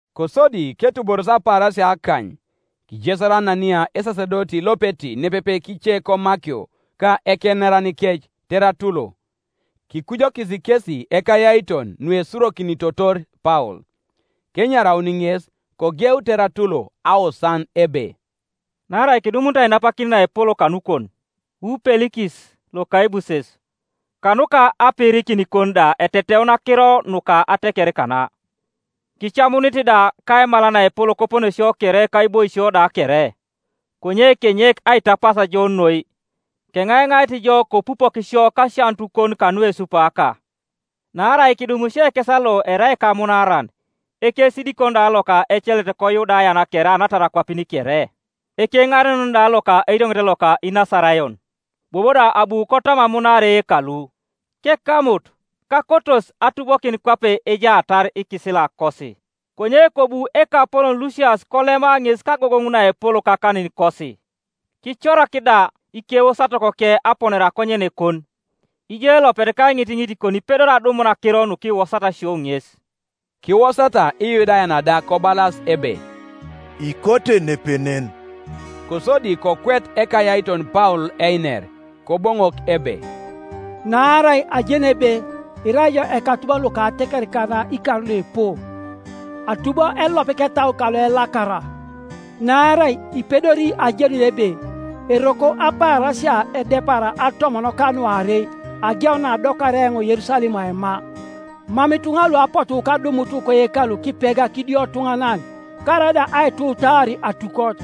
Kosodi ketuboros apaarasia akany, kijesar Anania esasedoti lopeti nepepe kice komakio, ka ekeneranikec, Teratulo. Kikujokis kesi ekayaiton nuesurokinitotor Paul. Kenyaraun ŋes, kogeu Teratulo aosan ebe: “Naarai kidumunit ainapakin naepol kanukon, wu Pelikis lokaibuses, kanuka apiirikinikon da eteteun akiro nuka ateker kana, kicamunit da kaimal naepol koponesio kere kaiboisio da kere. Konye kenyek aitapas jo noi, keŋaiŋait jo kopupok sio kasianutukon kanuesupaaka. Naarai kidum isio ekesa lo erai ekamunaaran, ekesidikon da loka ecelet koYudayan kere anatar akwapin kere, ekeŋarenon da loka erioŋet loka Inasarayon. Bobo da abu kotam amunaar eyekalu, kekamut, [kakotos atubokin kwape ejaatar ikisilakosi. Konye kobu ekapolon Lusias kolema ŋes kagogoŋ naepol kakaninikosi,] kicorak da ikewosatokoke aponare akonyenekon. Ijo elopet kaiŋitiŋitikon ipedori adumun akiro nukiwosat isio ŋes.” Kiwosata Iyudayan da kobalas ebe, “Ikote nepenen.” Kosodi kokwet ekayaiton Paul einer, Koboŋok ebe: “Naarai ajeni ebe irai ijo ekatubon loka ateker kana ikar luipu, atubo elop ketau kaloelakara, naarai ipedori ajenun ebe eroko apaarasia edepara atomon kanuarei ageun naadokaria eoŋ Yerusalem aima; mam ituŋa lu apotu kadumut koyekalu kipega kidiotuŋanan, karaida aituwutaar atukot,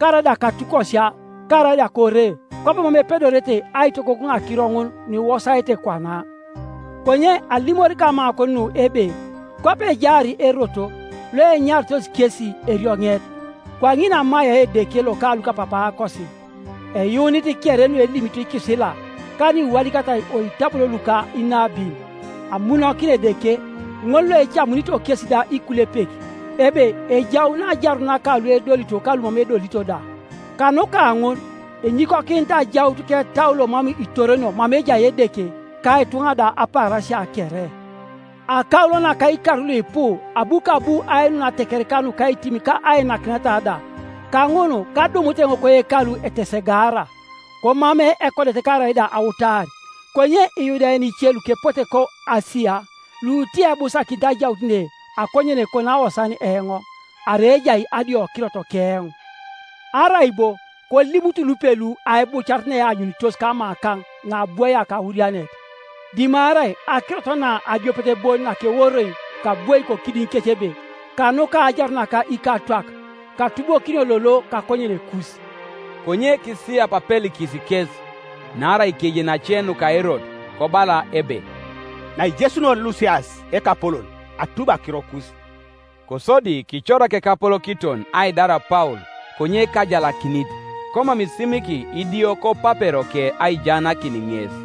karaida katukosia, karaida kore. Kwabo mam epedorete aitogogoŋ akiro ŋun nuiwosaete kwana. Konye alimori kamakon nu ebe kwape ejaar Erot, loenyarito kesi erioŋet, kwaŋin amaia Edeke loka lukapapaakosi, eyuunit kere nuelimito ikisila, ka nuiwadikatai oitabon luka inabin, amunokina Edeke, ŋol loecamunito kesi da ikulepek, ebe ejaun ajarun naka luedolito ka lumam edolito da. Kanuka ŋun enyikokinit ajaut ketau lomam itoronio mama ejai Edeke ka ituŋa da apaarasia kere. Akaulo naka ikar luipu abu kabu ainun atekereka nukaitim ka ainakineta da. Kaŋun kadumut eoŋ koyekalu etesegaara, komamei ekodet karaida autar. Konye Iyudayan ice lukepote ko Asia— lutiebusakinit ajaut ne akonyenekon aosan eoŋ, arai ejai adiokirot keoŋ, Arai bo kolimut lupelu aibucaret naeanyunitos kamakaŋ naabwoia kaurianet, dimarai akirot na adiopet bon nakeworoi kabwoi kokidiŋikec ebe, ‘Kanuka ajarun naka ikatwak katubokinio lolo kakonyenekus.’” Konye kisiyap Pelikis kes, naarai kejeni ace nuka Erot, kobala ebe, “Naijesunor Lusias ekapolon atubi akirokus.” Kosodi kicorak ekapolokiton aidar Paul konye kajalakinit, komam isimiki idio kopaperoke aijaanakin ŋes.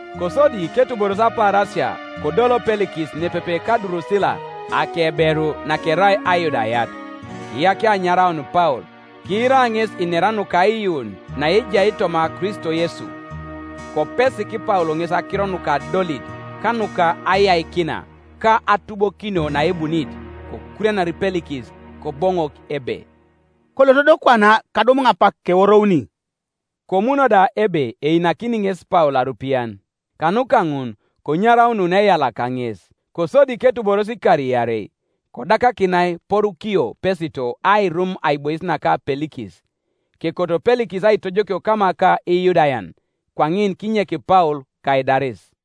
Kosodi ketuboros apaarasia kodol Pelikis nepepe ka Durusila akeberu, nakerai Ayudayat, kiyakia anyaraun Paul, kiira ŋes inera nuka aiyuun naejai toma Kristo Yesu. Kopesik Paul ŋes akiro nuka adolit, ka nuka ayaikina, ka atubokinio naebunit, kokurianar Pelikis, Koboŋok ebe, “Kolot do kwana; kadum eoŋ apak, keworouni.” Komuno da ebe einakini ŋes Paul arupian, Kanuka ŋun konyaraunun eyala kaŋes. Kosodi ketuboros ikar iarei, kodakakinai Porukio Pesito airum aibois naka Pelikis; kekoto Pelikis aitojokio kama ka Iyudayan, kwaŋin kinyek Paul kaidaris.